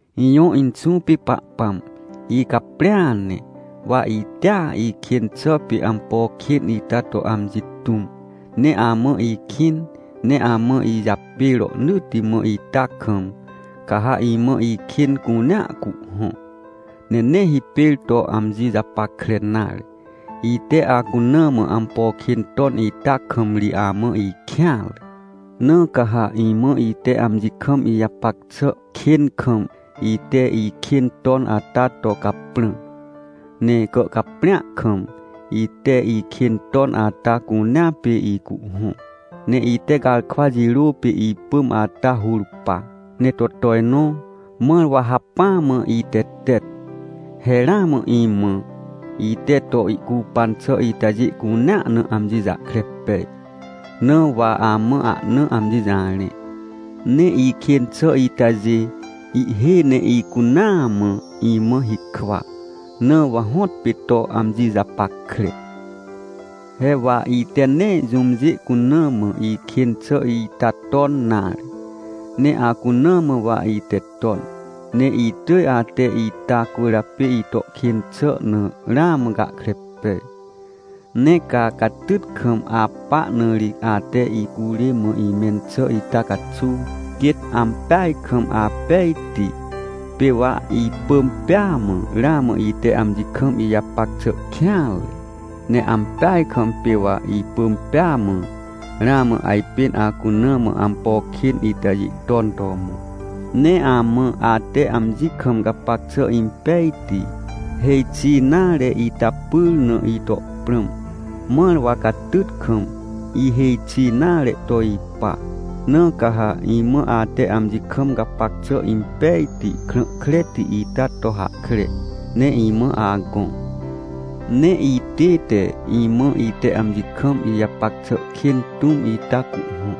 Ijõ Inxũ pê Pahpãm, icaprĩa ne. Wa itea ikên xà pê ampo kên ita to amji tũm. Ne amã ikĩn ne amã ijapê rohnỳtti mã ita kam, ca ha imã ikên cunea cuhhõ, ne nee hipêr to amji japackre nare. Ite acuna mã ampo kên ton ita kam ri amã ikêanre. Na ca ha imã ite amji kam ijapac xà kên kam, ite ikên ton ata to caprã. Ne gàhcaprĩa kam, ite ikên ton ata cunea pê icuhhõ, ne ite garkwa jirô pê ipỳm ata hur pa, ne to tojnõ, mãr wa hacpỹa mã itetet. He ramã imã, ite to ihcupan xà itajê cunea na, amji jahkre pej, na wa amã ahna amji jarẽ. Ne ikên xà itajê, ihhêj ne icunaa mã imã hikwa, na wa hõtpê to amji japackre. He wa ite nee jũmjê cuna mã ikên xà ita ton nare, ne acuna mã wa ite ton. Ne itỳj ate ita cwỳrjapê ito kên xà na ramã gahkre pej. Ne ca catyt kam apa na ri ate icurê mã imẽn xà ita caxuw, quêt ampeaj kam apejti. Pê wa ipỳm pêa mã ramã ite amji kam ijapac xà kêanre. Ne ampeaj kam pê wa ipỳm pêa mã, ramã ajpên acuna mã ampo kên itajê ton to mõ. Ne amã, ate amji kam gapac xà impejti, hêj xi nare ita pyr na ito prãm, mãr wa catyt kam, ihêj xi nare to ipa. Na ca ha imã ate amji kam gapac xà impejti, krã kreti ita to hahkre, ne imã agõ. Ne itête imã, ite amji kam ijapac xà kên tũm ita cuhhõ,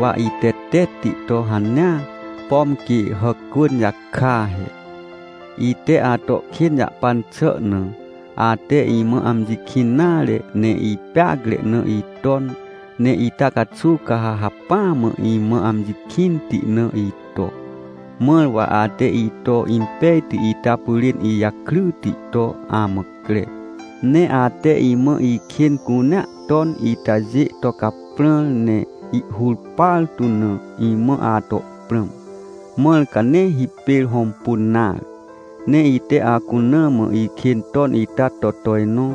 wa itetetti to hanea, pom quê hàcwỳn jaka he. Ite ato kên jahpan xà na, ate imã amji kĩn nare ne ipeacre na iton. Ne ita caxuw ca ha hacpỹa mã imã amji kĩnti na ito. Mãr wa ate ito impejti ita pyrên ijakryti to amã cre. Ne ate imã ikên cunea ton itajê to caprãr ne ihhur partu na, imã ato prãm, mãr ca nee hipêr hõmpun nare. Ne ite acuna mã ikên ton ita to tojnõ,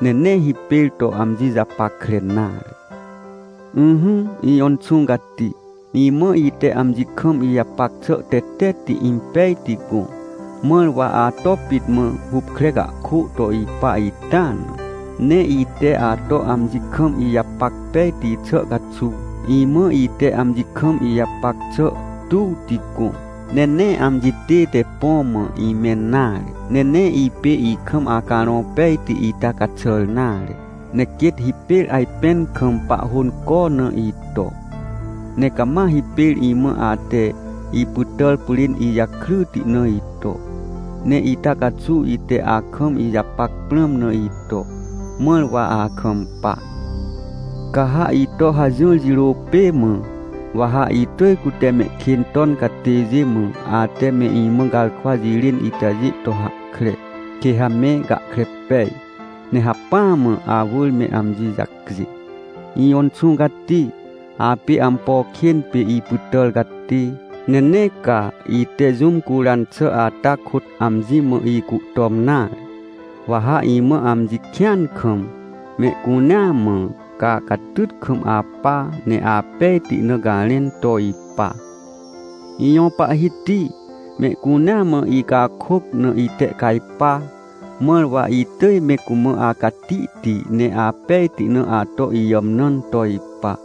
ne nee hipêr to amji japackre nare. Ỹhỹ, ijõ Inxũ Cati, imã ite amji kam ijapac xà tetetti impejti gõ, mãr wa ato pit mã hupkre cahkô to ipa ita na. Ne ite ato amji kam ijapac pejti xà caxuw, imã ite amji kam ijapac xà tuwti gõ. Ne nee amji tête põ mã imẽn nare, ne nee ipê ikam Acarõ Pejti ita caxàr nare, ne quêt hipêr ajpẽn kam pahhônco na ito. Ne cama hipêr imã ate ipytàr pyrên ijakryti na ito, ne ita caxuw ite akam ijapac prãm na ito, mãr wa akampa. Ca ha ito hajỹr jirô pê mã, wa ha itỳj cute mehkên ton catêjê mã, ate me imã garkwa jirên itajê to hahkre, quê ha me gahkre pej, ne hacpỹa mã awỳr me amji jacjê. Ijõ Inxũ Cati, apê ampo kên pê ipytàr catê, ne nee ca ite jũm curan xà ata kôt amji mã ihcuhtom nare. Wa ha imã amji kĩan kam, mehcunea mã, ca catyt kam apa, ne apejti na garẽn to ipa. Ijõ Pahhiti, mehcunea mã icakôc na itehcajpa, mãr wa itỳj me cumã acatihti ne apejti na ato ijàmnãn to ipa.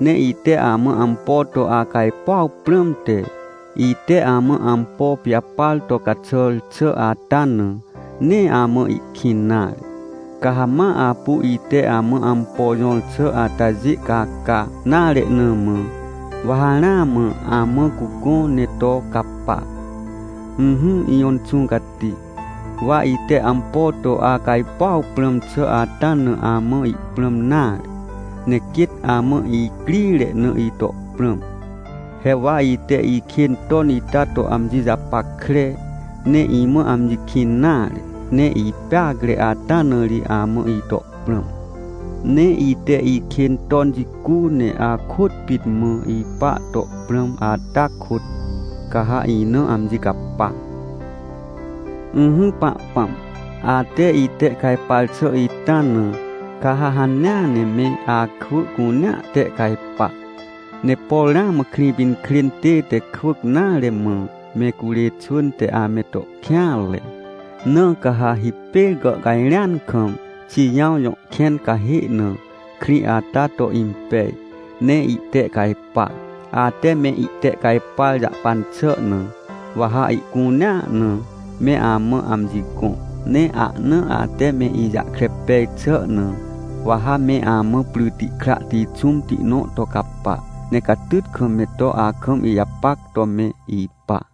Ne ite amã ampo to acajpuaw prãmte, ite amã ampo pijapar to caxàr xà ata na, nee amã ihkĩn nare. Ca ha ma apu ite amã ampo jõr xà atajê caca nare na mã, wa ha ramã amã cugõ ne to capa. Ỹhỹ ijõ Inxũ Cati, wa ite ampo to acajpuaw prãm xà ata na amã ihprãm nare, ne quêt amã icrire na ito prãm. He wa ite ikên ton ita to amji japackre, ne imã amji kĩn nare, ne ipeacre ata na ri amã ito prãm. Ne ite ikên ton jicu ne akôt pit mã ipa to prãm ata kôt, ca ha ina amji capa. Ỹhỹ Pahpãm, ate itehcajpar xà ita na, ca ha hanea ne me akwỳ cunea tehcajpa. Ne por ramã Krĩpinkrên tête kwỳc nare, mã me curê xwỳn te ame to kêanre, na ca ha hipêr gàhcajrẽan kam Xijãw jõ kẽn cahê na krĩ ata to impej, ne ihtehcajpa. Ate me itehcajpar jahpan xà na, wa ha ihcunea na me amã amji gõ. Ne ahna ate me ijahkre pej xà na, wa ha me amã pryti krahti xũmti nõ to capa, ne catyt kam me to akam ijapac to me ipa.